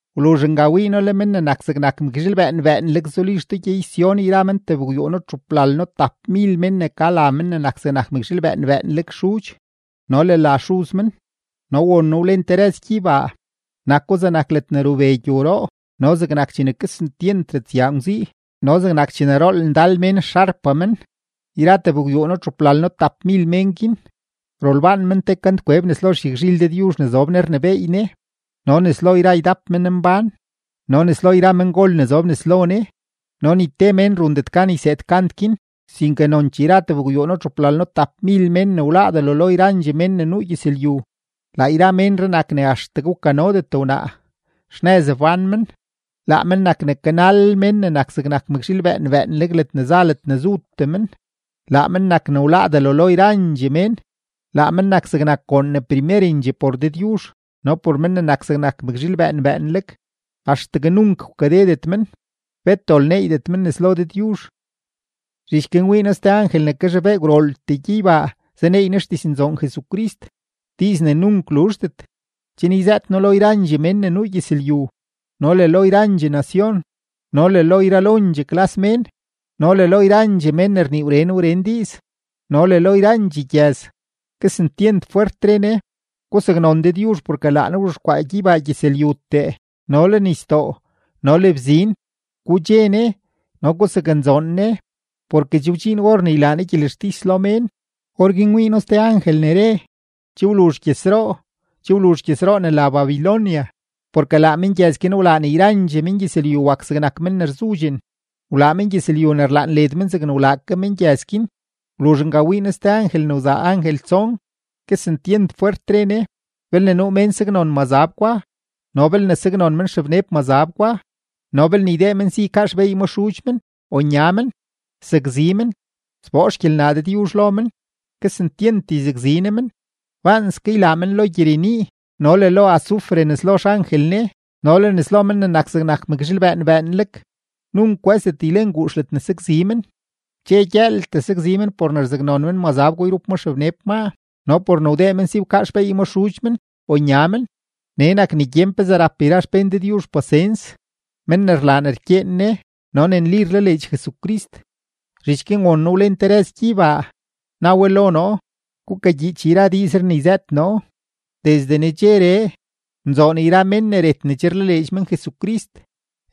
Wluzh nga wii noo le Men ne nak zegnak mëkzhiil bëën bëënleg zuli xtoo gyey-Sión yra men tebgwyuuno-txuplalno-tapmil mén ne ka la Men ne nak zegnak mëkzhiil bëën bëënleg xudx no le la Xuz men. No won noo wlen te rëz gyeybaa, nako zegnak ledne rube gyowroo no zegnak chene kesentyent ratsyaa ngwzii no zegnak chene rool ndal mén xarpa men. Yra tebgwyuuno-txuplalno-tapmil mén guin, rolbaan men te kantkweb nes lo xyagzhil Dëdyuzh ne zob Ne rnebééy Ne no nes lo yra ydap menmbán no nes lo yra mengol ne zob nes lo Ne, no ni te mén rundet gan yseed kant guin, sinke nonchee yra tebgwyuuno-txuplalno-tapmil mén ne wláá delo lo yrandxee mén ne nuu gyëzlyu. Laa yra ménree nak ne axtegue wkanodet wnaa, xnëz wbán men; laa men nak ne kanalel Men ne nak zegnak mëkzhiil bëën bëënleg ledne za ledne zutee men, laa men nak ne wláá delo lo yrandxee mén, laa men nak zegnak goon ne primerendxee por Dëdyuzh no por Men ne nak zegnak mëkzhiil bëën bëënleg. Axtegue nunk wkadedet men, bet dol neeydet men nes lo Dëdyuzh. Zhich guin wii noo ste angel ne kazhobee gwrooltee gyeybaa zaneey ne xdiznzoon Jesucrist, diiz ne nunk luzhdet, chen yzëët no lo yrandxee mén ne nuu gyëzlyu, no le lo yrandxee nacion, no le lo yralondxee klas mén, no le lo yrandxee men ne rnii wren wren diiz, no le lo yrandxee gyëz. Kesentyent fwert re ne: ―Gusaknon Dëdyuzh porke laa Ne wzhexkwaa gyeybaa gyëzlyutee no le nisdoo no le bzin. Gudxe Ne no gusaknzoon Ne, porke che wdxiin or ne ylaa Ne gyelextis lo mén. Orguin wii noo ste angel ne re: ―Che wluzh gyëzroo, che wluzh gyëzroo ne la Babilonia, porke laa mengyëz guin wlaa ne yrandxee mengyëzlyu wak zegnak men ne rzudxen, wlaa mengyëzlyu ne rlaan led men zegne wlaa ke mengyëz guin. Wluzh nga wii noo ste angel ne wzaa angel tson, kesentyent fwert re ne: ―Belne nuu mén saknon mazab gwa no belne saknon men xebneb mazab gwa no belne ydee men si ykaa xbeey ma xudx men o nya men, sakzi men, sboo xgyelnaa Dëdyuzh lo men; kesentyent yzakzi Ne men, baanske ylaa men lo gyirenii no le lo azufre nes lo xangel Ne no le nes lo Men ne nak zegnak mëkzhiil bëën bëënleg. Nunk kwë́zdet ylen guux ledne sakzi men, dxe gyëëltee sakzi men por ne rzaknon men mazab gwa yrup ma xebneb maa no por ne wdee men si wkaa xbeey ma xudx men o nya men. Nee nak ne gyen pezee rap yra xpén Dëdyuzh pasens, men ne rlaa ne rkyeen Ne no ne nli rlaleedx Jesucrist. Zhich guin won noo wlen te rëz gyeybaa, na we lo noo: ―Gukagyiich yra diizree ne yzëët noo: “Desde nedxeree, nzoon yra mén ne ret ne che rlaleedx men Jesucrist.”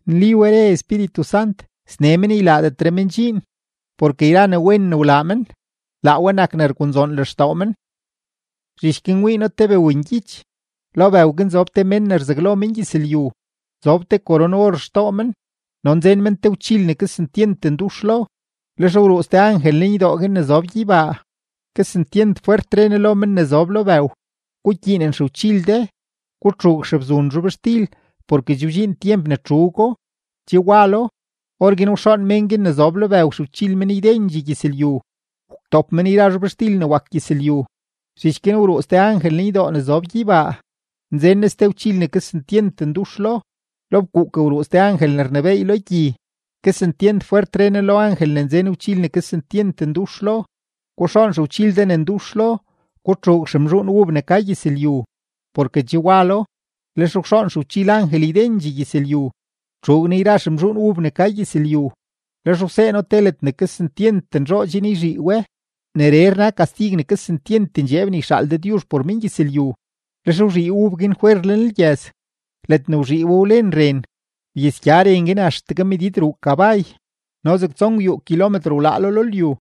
Nli we, re Espíritu Sant, sne men ylaadetre men dxiin, porke yra ne wen ne wlaa men, laa we nak ne rgunzoon lextoo men. Zhich guin wii noo te bëwngyich. Lo bëw guin zob te mén ne rzaglo mengyëzlyu; zob te koron-or xtoo men no nzen men te gwchil ne kesentyent ndux lo. Lex wruu ste angel lenydoo guin ne zob gyeybaa, kesentyent fwert re ne lo men ne zob lo bëw: ―Gukyiinen xegwchil de, gutxuug xebzun zhobxtil porke che wdxiin tyemp ne txuugo, che walo. Orguin wxoon mén guin ne zob lo bëw xegwchil men ydendxee gyëzlyu, wtop men yra zhobxtil ne wak gyëzlyu. Zhich guin wruu ste angel lenydoo ne zob gyeybaa, nzen ne ste gwchil ne kesentyent ndux lo. Lo fkuuk wruu ste angel ne rnebééy lo gyi, kesentyent fwert re ne lo angel ne nzen gwchil ne kesentyent ndux lo: ―Guxoon xegwchil de ne ndux lo, gutxuug xemzhuun ub ne ka gyëzlyu, porke che walo. Lex wxoon xegwchil angel ydendxee gyëzlyu, wtxuug ne yra xemzhuun ub ne ka gyëzlyu, lex wsee no te ledne kesentyent nzhoo chen yzhii we; neree rna kastig ne kesentyent ndxeeb ne yxaal Dëdyuzh por mengyëzlyu. Lex wzhii ub guin fwer lenlgyëz; ledne wzhii we wlen ren, wyasgya ren guin axtegue medid ruu kabay no zeg tsongwyuu kilometro wlaalo lo lyu.